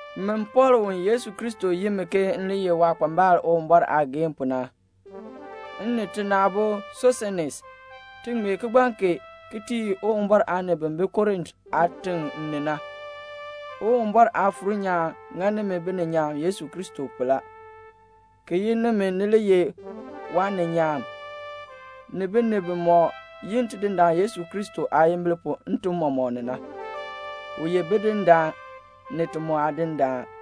Min Pɔɔl u Yesu Kristo yin mi ke m le ye waakpambal Uwumbɔr aageehn pu na, m ni tina aabo Sosenes, ti ŋmee kigbaŋ kee ki tii Uwumbɔr aanib bi bi Korint aatiŋ ni na. Uwumbɔr Aafuur nyaan ŋa nimi bininyaan Yesu Kristo pu la, ki yin nimi ni li ye waaninyaan, ni binib bimɔk yi Tidindaan Yesu Kristo aayimbil pu ntim mɔmɔk ni na. U ye Bidindaan, ni ti mu Aadindaan.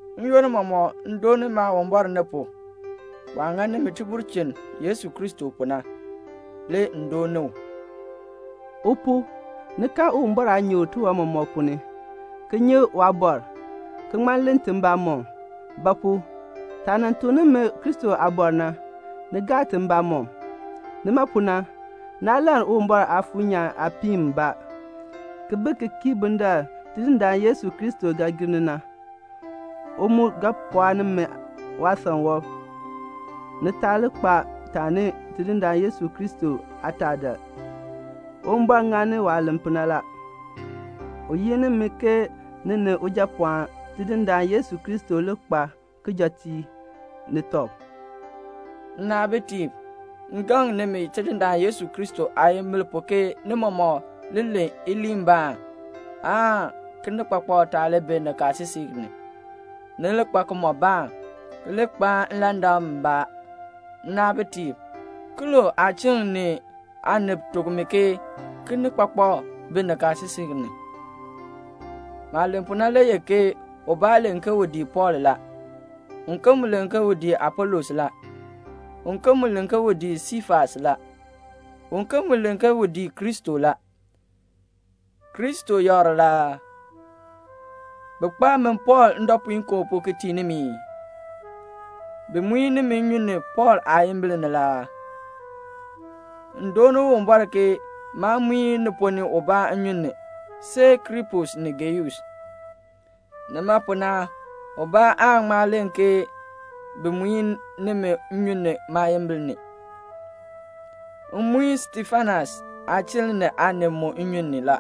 N-yoonn mɔmɔk m dooni Maawumbɔr ni pu. Waah ŋa nimi tibulchin Yesu Kristo pu na, le m dooni u. U pu, ni kan Uwumbɔr aanyoor tiwan mɔmɔk ponn ni, ki nyi waabɔr, ki ŋma len ti mbamɔm. Ba pu? taah nan tuk nimi Kristo aabɔr na, ni gaa ti mbamɔm. Nima pu na naa lann Uwumbɔr Aafuur nyaan aapiin mbaa, ki bi ki kii bundaln Tidindaan Yesu Kristo ga gir ni na. U mu ga pɔɔ nimi waasan wɔb, ni taa li kpa taani Tidindaan Yesu Kristo aataadaal. Uwumbɔr ŋani waah len pu na la. U yin nimi ke ni ni Ujapɔɔn Tidindaan Yesu Kristo li kpaa kijɔteek ni tɔb. Nnaabitiib, m gaŋ nimi Tidindaan Yesu Kristo aayimbil pu ke ni mɔmɔk li len iliinbaan, aan kinikpakpak taa li bi nikaasisik ni; ni li kpa kimɔbaan, ki li kpaan nlandak mbaa. Nnaabitiib, Klo aachiln ni aanib tuk mi ke kinikpakpak bi nikaasisik ni. Maah len pu na le ye ke ubaa len ke u dii Pɔɔl la, uken mu len ke u dii Apolos la, uken mu len ke u dii Siifas la, uken mu len ke u dii Kristo la. Kristo yakr la aa? Bi kpaa min Pɔɔl ndɔpuinkoo pu ki tii nimi ii? Bi muin nimi nnyun ni Pɔɔl aayimbil ni la aa? M dooni Uwumbɔr ke maa muin ni ponn ni ubaa nnyun ni, see Krispus ni Geus. Nima pu na ubaa aan ŋma len ke bi muin nimi nnyun ni maayimbil ni. M muin Stefanas aachiln ni aanib mu nnyun ni la.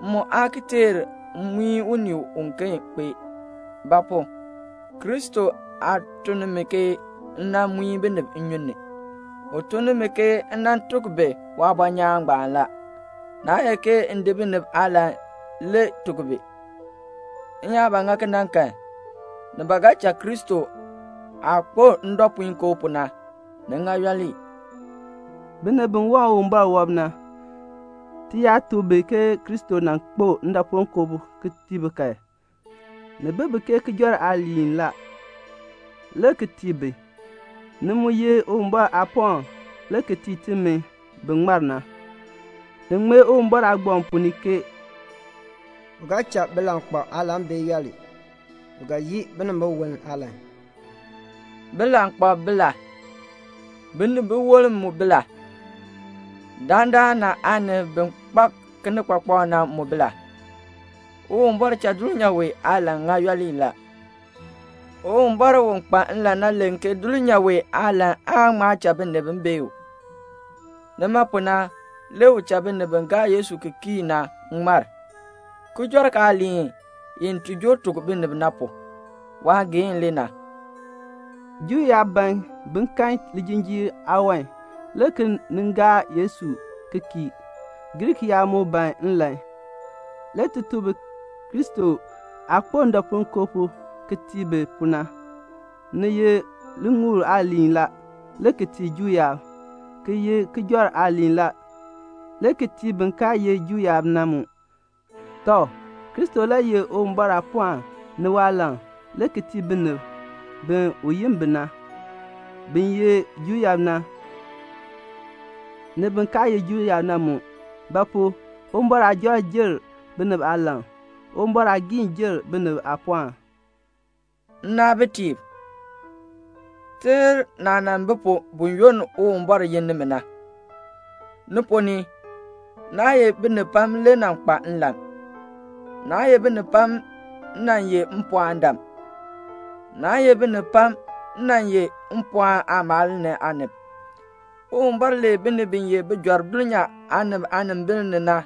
M mu aa ki teer m muin unii uken kpee. Ba pu? Kristo aa tun ni mi ke m nan muin binib nnyun ni. U tun ni mi ke m nan tuk bi waabɔnyaan ngbaan la. Naa ye ke m di binib aalan le tuk bi. M yaa ba ŋa kena kan, ni ba ga cha Kristo aah kpo ndɔpuinkoo pu na, ni ŋa yooli. Binib bi waŋ Uwumbɔr wɔb na, ti yaa tuk bi ke Kristo nan kpo ndɔpuinkoo pu ki tii bi kan, ni bi ke kijɔrk aaliin la, le ki tii bi. Ni mu ye Uwumbɔr aapɔɔn le ki tii timi bi ŋmar na. Ni ŋmee Uwumbɔr aagbaŋ ponn ni ke "U ga cha bilankpalb aalan bee yooli; u ga yii binibiwolm aalan." Bilankpalb bi la? Binibiwolm mu bi la? Dandana aanib bi kpak kinikpakpak na mu bi la? Uwumbɔr cha dulnyaa wee aalan ŋa yooli la. Uwumbɔr u kpa nlan na len ke dulnyaa wee aalan aa ŋma cha binib bee u. Nima pu na le u cha binib bi gaa Yesu ki kii na ŋmar, kijɔrk aaliin i ti joo tuk binib na pu. Waageehn le na. Juu yaab ban bin kan lijinjiir aawan, le ki nin gaa Yesu ki kii, Griik yaab mu ban nlan. Le ti tuk bi Kristo aah kpo ndɔpuinkoo pu ki tii bi pu na. Ni ye liŋuul aaliin la, le ki tii Juu yaab, ki ye kijɔrk aaliin la, le ki tii bin kaa ye Juu yaab na mu. Tɔ, Kristo le ye Uwumbɔr aapɔɔn ni waalan le ki tii binib bi u yin bi na, bin ye Juu yaab na, ni bin kaa ye Juu yaab na mu. Ba pu? Uwumbɔr aajɔrk jer binib aalan. Uwumbɔr aagiin jer binib aapɔɔn. Nnaabitiib, teer naah nan bi pu buyoonn Uwumbɔr yin nimi na. Ni ponn ni, naa ye binib pam le nan kpa nlan, naa ye binib pam nan ye mpɔɔndam, naa ye binib pam nan ye mpɔɔn aamaal ni aanib. Uwumbɔr lee binib bi ye bijɔrb dulnyaa aanib aanimbil ni la,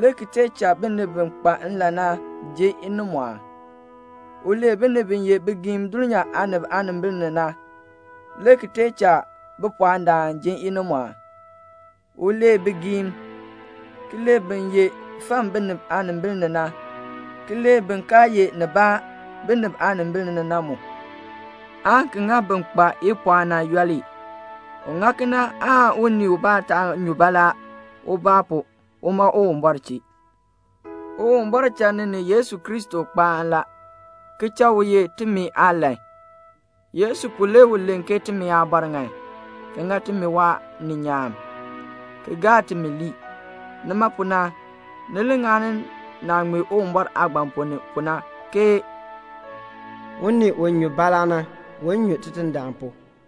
le ki tee cha binib bi kpa nlan na ji inimɔɔn. U lee binib bi ye bigiim dulnyaa aanib aanimbil ni na, le ki tee cha bipɔɔndam ji inimɔɔn. U lee bigiim, ki lee bin ye fam binib aanimbil ni na, ki lee bin kaa ye nibaa binib aanimbil ni na mu, aan ki ŋa bin kpa ipɔɔn na yooli. U ŋa kena aan unii ubaa taa nyu baalaa ubaa pu uma Uwumbɔr chee. Uwumbɔr cha ni ni Yesu Kristo kpaan la, ki cha u ye timi aalan. Yesu pu le u len ke timi aabɔr ŋan, ki ŋa timi waaninyaan, ki gaa timi lii. Nima pu na, ni li ŋani naah ŋmee Uwumbɔr aagbaŋ ponn ni pu na, ke "Unii u nyu baalaa na, un nyu Tidindaan pu."